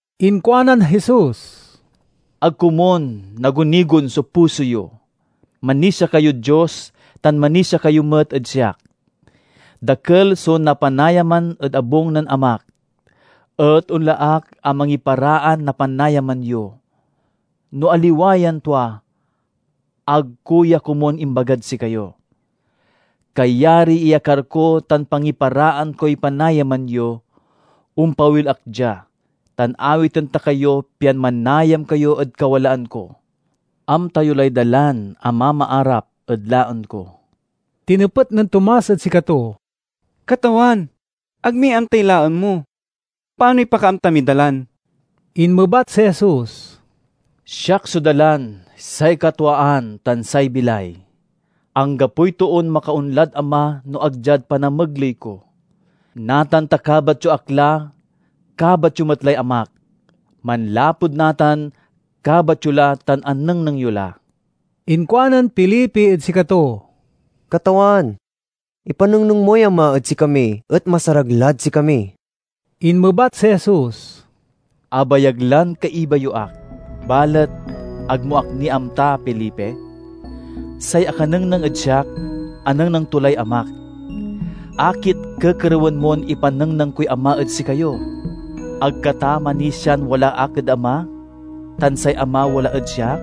Inkuanan Jesus, "Ag komun nagunigon so puso yo; manisia kayod Dios tan manisia kayo met ed siak. Dakel so napanayaman ed abung nen Amak, et onla ak a mangiparaan na panayaman yo. No aliwa yan tua, ag ko ya komun imbagad sikayo. Kayariy iyakar ko tan pangiparaan koy panayaman yo, ompawil ak dia, tan awiten ta kayo pian manayam kayo ed kawalaan ko. Amta yo lay dalan a mamaarap ed laen ko." Tinepet nen Tomas ed sikato, "Katawan, ag mi amtay laen mo, panoy pakaamta miy dalan?" Inmebat si Jesus, "Siak so dalan, say katwaan, tan say bilay; anggapoy toon makaonlad Ama no ag diad panamegley ko. Natan ta kabat yo ak la, kabat yo met lay Amak. Manlapud natan, kabat yo la tan anengneng yo la." Inkuanen Felipe ed sikato, "Katawan, ipanengneng moy Ama ed sikami, et masarag lad sikami." Inmebat si Jesus, "Abayag lan kaiba yo ak, balet ag mo ak ni amta, Felipe? Say akanengneng ed siak, anengneng to lay Amak. Akit kekerewen mon ipanengneng koy Ama ed sikayo? Ag ka ta manisian wala ak ed Ama, tan say Ama wala ed siak?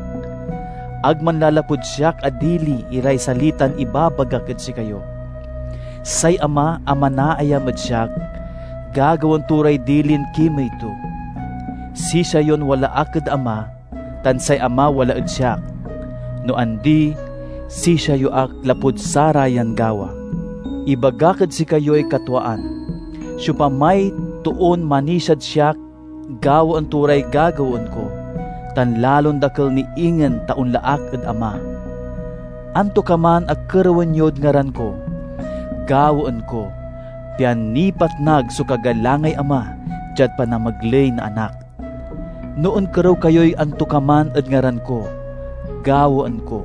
Ag manlalapud siak a dili iray salitan ibabagak ed sikayo. Say Ama a manaayam ed siak gagawaen to ray dilin kimey to. Sisia yon wala ak ed Ama, tan say Ama wala ed siak. No andi, sisia yo ak lapud sarayan gawa. Ibagak ed sikayoy katwaan: siopamay toon manisiad siak gawaen to ray gagawaen ko, tan lalon dakel ni ingen ta onla ak ed Ama. Antokaman a kerewen yod ngaran ko, gawaen ko, pian nipatnag so kagalangay Ama diad panamegley na Anak. No onkerew kayoy antokaman ed ngaran ko, gawaen ko."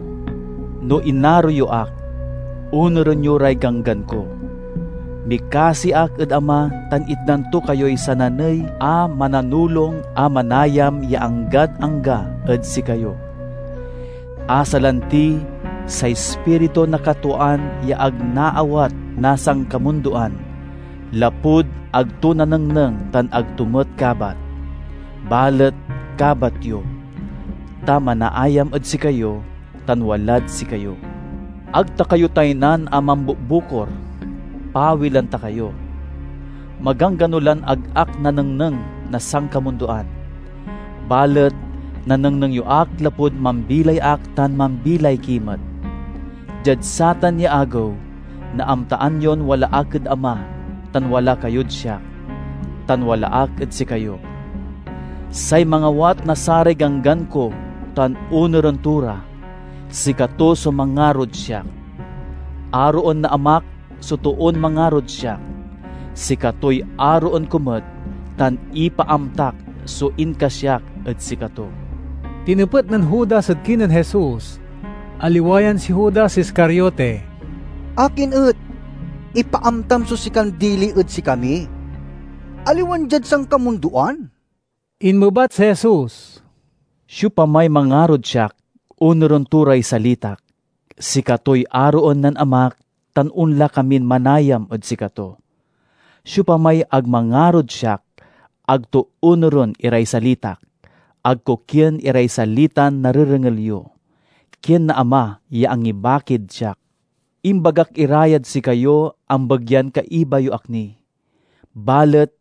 "No inaro yo ak, onuren yo ray ganggan ko. Mikasi ak ed Ama tan itdan to kayoy sananey a Mananulong a manayam ya anggad angga ed sikayo, a salanti say Ispiritu na katwaan ya ag naawat na sankamundoan, lapud ag to nanengneng tan ag to met kabat. Balet kabat yo, ta manaayam ed sikayo tan walad sikayo. "Ag ta kayo taynan a mambukbukor; pawilen ta kayo. Maganggano lan ag ak nanengneng na sankamundoan. Balet nanengneng yo ak lapud mambilay ak tan mambilay ki met. Diad satan ya agew, naamtaan yon wala ak ed Ama tan wala kayod siak, tan wala ak ed sikayo. "Say mangawat na saray ganggan ko tan onuren to ra, sikato so mangarod siak. Aroen na Amak so toon mangarod siak; sikatoy aroen ko met tan ipaamtak so inkasiak ed sikato." Tinepet nen Judas ed kinen Jesus (aliwa yan si Judas Iscariote), "Akin et ipaamtam so sikan dili ed sikami, aliwan diad sankamundoan?" Inmebat si Jesus, "Siopamay mangarod siak, onuren to ray salitak; sikatoy aroen nen Amak tan onla kamin manayam ed sikato. Siopamay ag mangarod siak, ag to onuren iray salitak. Ag ko kien iray salitan narerengel yo. Kien na Ama ya angibakid siak. "Imbagak ira yad sikayo ambegyan kaiba yo ak ni. Balet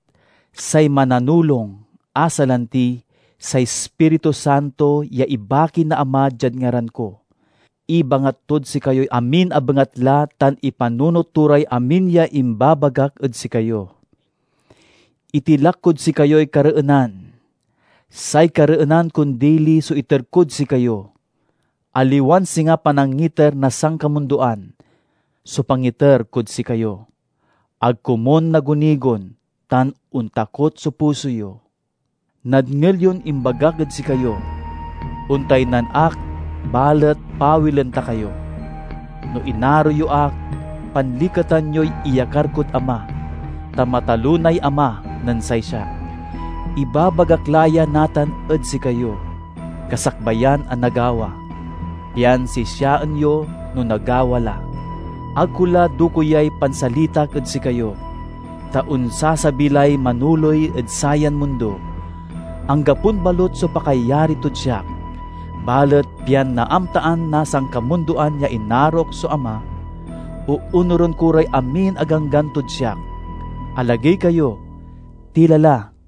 say Mananulong, a salanti say Ispiritu Santo ya ibaki na Ama diad ngaran ko, ibangat tod sikayoy amin a bengatla tan ipanunot to ray amin ya imbabagak ed sikayo. "Itilak kod sikayoy kareenan; say kareenan kon dili so iter kod sikayo. Aliwan singa panangiter na sankamundoan so pangiter kod sikayo. Ag komun nagunigon tan ontakot so puso yo. Nadngel yon imbagak ed sikayo, 'Ontaynan ak, balet pawilen ta kayo.' No inaro yo ak, panliketan yoy iyakar kod Ama, ta matalonay Ama nen say siak. Ibabagak la ya natan ed sikayo, kasakbayan a nagawa, pian sisiaen yo no nagawa la. Ag ko la dokeyay pansalitak ed sikayo, ta onsasabi lay manoley ed sayan mundo. Anggapon balut so pakayari tod siak. Balet pian naamtaan na sankamundoan ya inarok so Ama, oonuren ko ray amin a ganggan tod siak. "Alagey kayo. Tila la!"